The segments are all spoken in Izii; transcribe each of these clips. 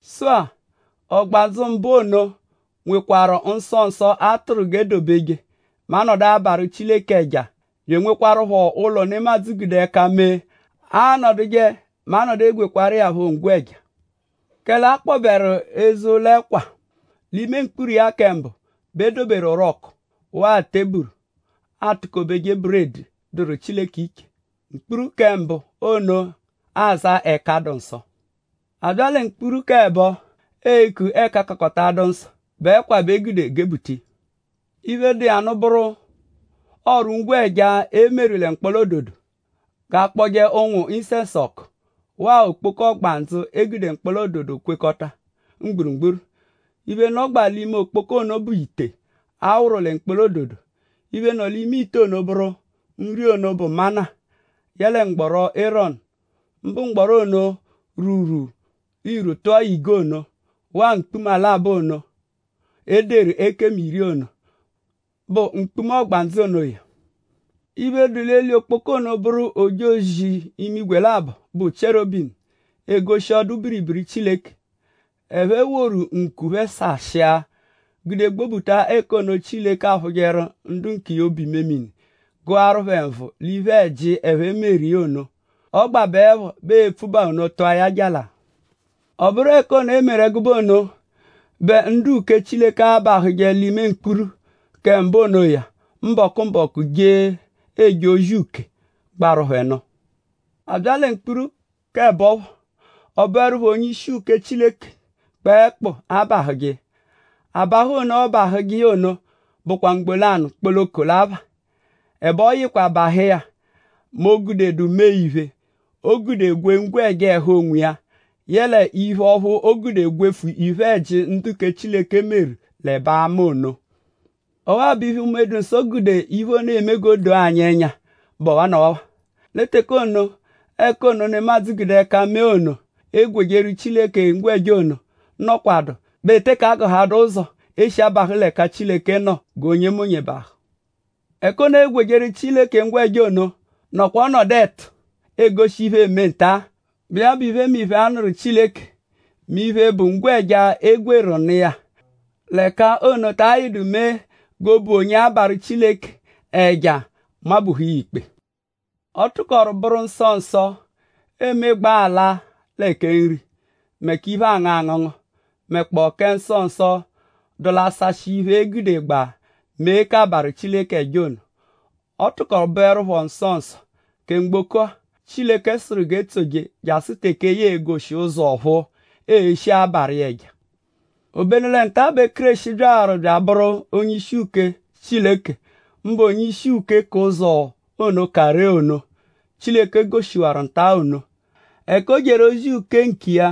Sụ-a; ọgbandzu mbụ ono nwekpọkwaaru nsọ nsọ, a tụru g'e dobeje mẹ a -nọdu abarụ Chileke ẹja bya enwekwarụpho ụlo, nemadzụ gude ẹka mee, aanọduje mẹ a -nọdu egwekwaru iya phọ ngwẹja. Kẹle a kpọberu eze ụlo-ẹkwa. L'ime mkpuru iya kẹ mbụ bẹ e doberu orọku; waa teburu, aatukobeje buredi, dụru Chileke iche. Mkpuru kẹ mbụ ono aza Ẹka-dụ-nsọ. A bya lẹ mkpuru k'ẹbo eku Ẹka-kakọta-adụ-nsọ bụ ẹkwa bẹ e gude gebuta iya. Iphe, dụ iya nụ bụru ọru-ngwẹja, e meru lẹ mkpọla-ododo g'akpọje ụ̀nwù-isẹnsu ọku; waa okpoko ọgbandzu, e gude mkpọla-ododo kwekọta mgburugburu. Iphe nọgbaa l'ime okpoko ono bụ ite, a wụru lẹ mkpọla-ododo. Iphe, nọ l'ime ite ono bụru nri ono, bụ mana; yẹe mgbọro Erọnu; mbụ mgbọro ono, rwuru irwu tụa ige ono; waa mkpuma labọ ono, e deru ekemu iri ono, bụ mkpuma ọgbandzu onoya. Iphe, dụ l'eli okpoko ono bụru ojozi-imigwe labọ, bụ Chierobimu, egoshi ọdu-biribiri Chileke. Ẹphe woru ǹkù phẹ sashịa gude gbobuta ẹka ono, Chileke aphụjeru ndu nkiya obu-imemini; gụaru phẹ nvụ l'iphe-ẹji, ẹphe meru ono. Ọ gbabeẹpho bẹ e-pfubaa ono tụa ya jalaa. Ọ bụru ẹka ono, e meru ẹgube ono bẹ ndu-uke Chileke abahụje l'ime mkpuru kẹ mbụ onoya mbọku-mbọku je eje ozi uke, gbaru phẹ nụ. A bya lẹ mkpuru k'ẹbo phọ; ọ bụerupho onye-ishi uke Chileke kpẹekpu l'abahụje iya. Abahụ ono, ọobahuje iya ono bụkwa mgbo lanụ kpoloko l'apha. Ẹbe ọ yịkwa bahụ iya mẹ o -gudedu mee-iphe, oo-gude gwee ngwẹja ẹhu onwiya yẹle mee-iphe, ọphu oo-gude gwefu iphe-ẹji ndu kẹ Chileke meru l'ẹbe ama ono. Waa iphe, Unme-dụ-Nsọ gude iphe ono eme g'o doo anyi ẹnya bụ ọwanawa. Lẹ teke ono, ẹka ono, nemadzụ gude ẹka mee ono, eegwejeru Chileke ngwẹja ono nọkwadu bẹ e teke agụhadu ụzo, e shi abahụ l'ẹka Chileke nọ g'onyemonye bahụ. Ẹka ono, eegwejeru Chileke ngwẹja ono nọkwa ọnodu ẹtu, egoshi iphe, eme nta-a, bụ iya bụ l'iphemiphe, a nụru Chileke mẹ iphe, bụ ngwẹja, e gwerụ nụ iya l'ẹka ono ta ayịdu mee g'obu onye abarụ Chileke ẹja nmabuhu iya ikpe. Ọ tụkoru bụru nsọ nsọ, eemegbaa ala lẹ kẹ nri; mẹ k'iphe, aangụ angụngu; mẹkpoo kẹ nsọ nsọ, dụ l'asashị iphe, e gudegbaa mee k'abarụ ẹja ono. Ọ tụkoru bụerupho nsọ nsọ kẹ mgboko-a, Chileke sụru g'e tsoje jasụ teke ya e-goshi ụzo ọ̀phúú, ee-shije abarụ iya ẹja. Obenu lẹ nta-a bẹ Kéreshi byawaru bya abụru onye-ishi uke Chileke; mbụ onye-ishi uke k'ụzo ono, ka ree ono, Chileke goshiwaru nta-a ono. Ẹka o jeru ozi uke iya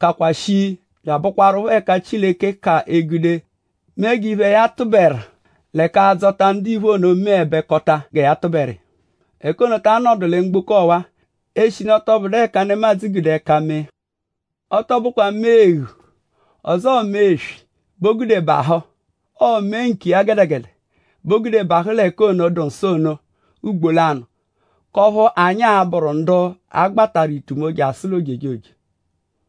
kakwa shii bya abụkwarupho ẹka Chileke ka egude mee g'iphe, ya tụberu lẹ k'adzọta ndiphe ono meẹbekota gẹ ya tụberu iya. Ẹka ono ta nọdu lẹ mgboko ọwa; eshinu ọ tọ bụdu ẹka nemadzụ gude ẹka mee. Ọ tọ bụkwa mee eghu ọzoo mee eswi bẹ o gude bahụ; ọo mee nkiya gẹdegede bẹ o gude bahụ l'ẹka ono dụ nsọ ono ugbo lanụ; k'ọphu anyi a-bụru ndu a gbatarụ l'itumo jasụ l'ojejoje.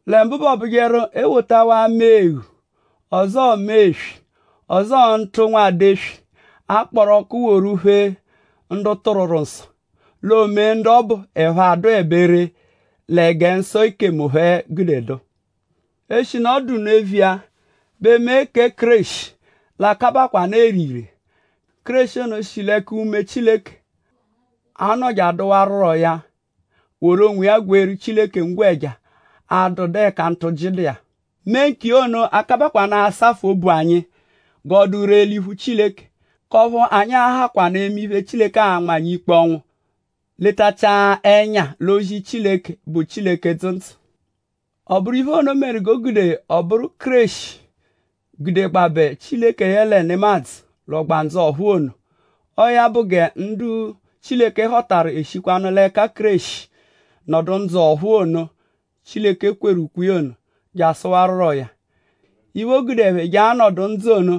Lẹ mbụ bẹ ọobujeru e wotawaa mee eghu; ọzoo mee eswi; ọzoo ntụ nwada eswi, a kpọru ọku woru phee ndu tụrwuru nsọ; l'o mee ndu ọbu ẹphe adụebe ree lẹ gẹ nsọ ekemu phẹ gude dụ. Eshinu ọ dụ nno eviya bẹ mee kẹ Kéreshi l'a-kabakwanụ ere ire. Kéreshi ono shi l'ẹka Unme Chileke, anọ je-adụwaruro ya woru onwiya gweeru Chileke ngwẹja, adụdu ẹka ntụji dụ iya. Mee nkiya ono a-kabakwaanụ asafụ obu anyi g'ọ dụ ree l'iphu Chileke; k'ọphu anyi a-hakwanụ eme iphe, Chileke a-nma anyi ikpe ọnwu; letachia ẹnya l'ozi Chileke, bụ Chileke dzụ ndzụ. Ọ bụru iphe ono meru g'o gude ọ bụru Kéreshi gudegbabẹ Chileke yẹle nemadzụ l'ọgbandzu ọ̀phúú ono. Ọo ya bụ gẹ ndu Chileke họtaru eshikwanụ l'ẹka Kéreshi nọdu ndzụ ọ̀phúú ono, Chileke kweru ukwe iya ono jasụwaruro ya. Iphe, o gude ẹphe jee l'anọdu ndzụ ono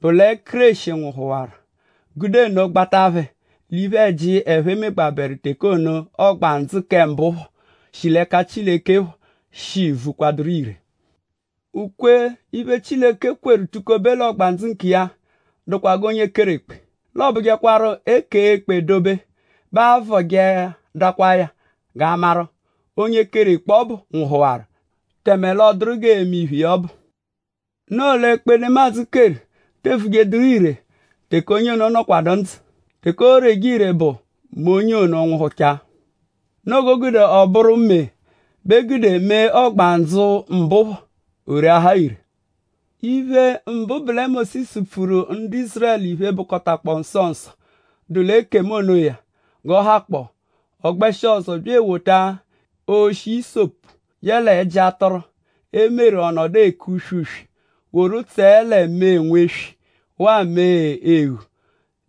bụ lẹ Kéreshi nwụhuwaru; gude nno gbata phẹ l'iphe-ẹji, ẹphe megbabẹru teke ono, ọgbandzu kẹ mbụ phọ, shi Chileke l'ẹka phọ shi vukwaduru ire. Ukwe-iphe, Chileke kweru tukobe l'ọgbandzu nkiya dụkwa g'onye keru ekpe. L'ọobujekwaru; e -kee ekpe dobe bẹ aavọjeadakwaa ya g'a maru:?onye keru ekpe ọbu nwụhuwaru; tẹme l'ọ dụru g'ee-me iphe iya ọbu. Noo l'ekpe, nemadzụ keru te evujeduru ire teke onye ono nọkwadu ndzụ. Teke ooreje ire bụ mẹ onye ono nwụhuchaa. Noo g'o gude ọ bụru mee bẹ e gude mee ọgbandzu mbụ phọ; o reahaa ire. Iphe mbụ bụ lẹ Mósisu pfuru ndu Ízurẹlu iphe, bụkotakpoo nsọ nsọ, dụ l'ekemu onoya g'ọ hakpọo. Ọ gbẹshi ọzo bya ewota oshi ịsopu yẹle ẹji atụru, e meru ọ nọdu eke uswe-uswe; woru tsẹe lẹ mee nweswi; waa mee eghu;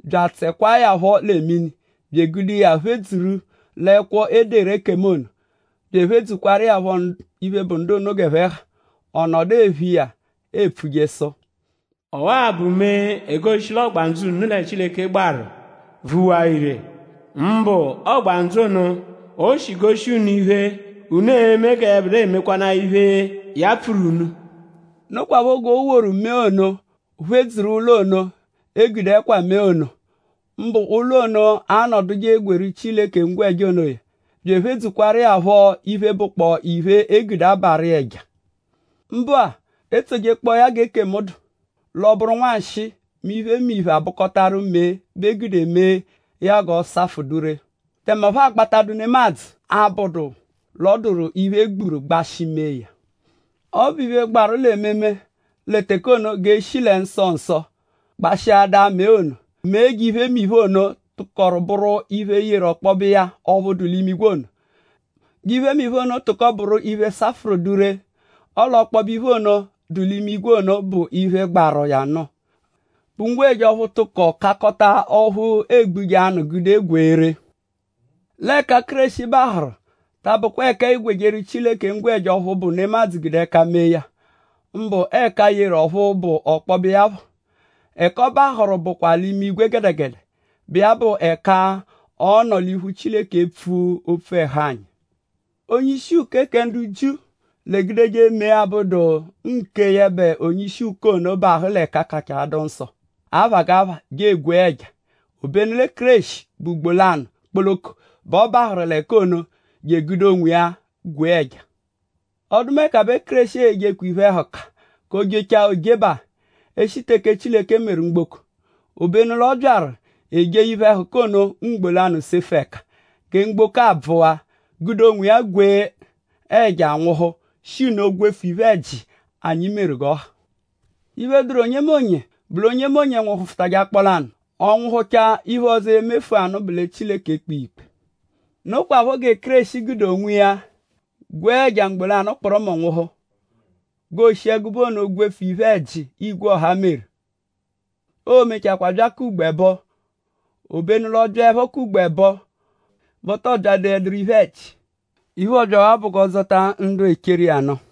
bya atsẹkwaa ya phọ lẹ mini bya egude iya phedzuru l'ẹkwo, e deru ekemu ono; bya ephedzukwaru iya phọ iphe, bụ ndu ono g'ẹphe ha. Ọ nọdu ephe iya bya epfuje sụ: “Ọwa-a bụ mee, egoshi l'ọgbandzu unu lẹ Chileke gbaru vuwaa ire; mbụ ọgbandzu ono, o shi goshi unu iphe, unu e-me gẹ yẹbedua emekwanaa iphe, ya pfuru unu.” Nokwaphọ g'o woru mee ono phedzuru ụlo ono, e gude ẹkwa mee ono; mbụ ụlo ono, aanọduje gweeru Chileke ngwẹja onoya; bya ephedzukwaru iya phọ l'iphe, bụkpoo iphe, e gude abarụ iya ẹja. Mbụ-a; e -tsojekpọo ya g'ekemu dụ; l'ọ bụru nwanshịi mẹ iphemiphe abụkotaru mee bẹ eegudeje mee ya g'ọ safụ dụ ree. Tẹme ọphu aa-gbatadu nemadzụ abụdu l'ọ dụru iphe, e gburu gbashị mee ya. Ọ bụ iphe, gbaru l'ememe lẹ teke ono; g'e shi lẹ nsọ nsọ gbashịada mee ono; mee g'iphemiphe ono, tụkoru bụru iphe, yeru k'ọkpobe iya ọphu dụ l'imigwe ono; g'iphemiphe ono tụko bụru iphe, safụru dụ ree. Ọle ọkpobe iphe ono, dụ l'imigwe ono bụ iphe, gbaru iya nụ bụ ngwẹja ọphu tụkoru kakọta ọphu eegbuje anụ gude gwee ree. L'ẹka Kéreshi bahụru ta abụkwa ẹka eegwejeru Chileke ngwẹja ọphu bụ nemadzụ gude ẹka mee ya; mbụ ẹka yeru ọphu bụ ọkpobe iya phọ. Ẹka ọ bahụru bụkwa l'imigwe gẹdegede, bụ iya bụ ẹka ọ nọ l'iphu Chileke epfu opfu ẹhu anyi. Onye-ishi uke kẹ ndu Jiu l'egudeje mee, abụdu kẹ yẹbe onye-ishi uke ono bahụ lẹ Ẹka-kakọta-adụ-nsọ ono aphagapha je egwee ẹja. Obenu lẹ Kéreshi bụ ugbo lanụ kpoloko bẹ ọ bahụru l'ẹka ono je egude onwiya gwee ẹja. Ọdumeka bẹ Kéreshi e-je iphe-ẹhuka k'o -jechaa oojebaa; eshi teke Chileke meru mgboko. Obenu l'ọ byaru ejee iphe-ẹhuka ono mgbo lanụ sefu ẹka; gẹ mgboko abvụwa-a; gude onwiya gwee ẹja nwụhu; shi nno gwefu iphe-ẹji, anyi meru g'ọ ha. Iphe, dụru onyemonye bụ l'onyemonye nwụhufutaje akpọ lanụ; ọ nwụhuchaa; iphe ọzo, e-mefụanu bụ lẹ Chileke e-kpe iya ikpe. Nokwaphọ gẹ Kéreshi gude onwiya gwee ẹja mgbo lanụ kpụrumu nwụhu g'ooshi ẹgube ono gwefu iphe-ẹji, igwe ọha meru. Oo-mechakwaa bya k'ugbo ẹbo; obenu l'ọ byaẹpho k'ugbo ẹbo bẹ ọ tọ byadoẹduru iphe-ẹji. Iphe, ọobyawaa bụ g'ọ dzọta ndu echeru iya nụ.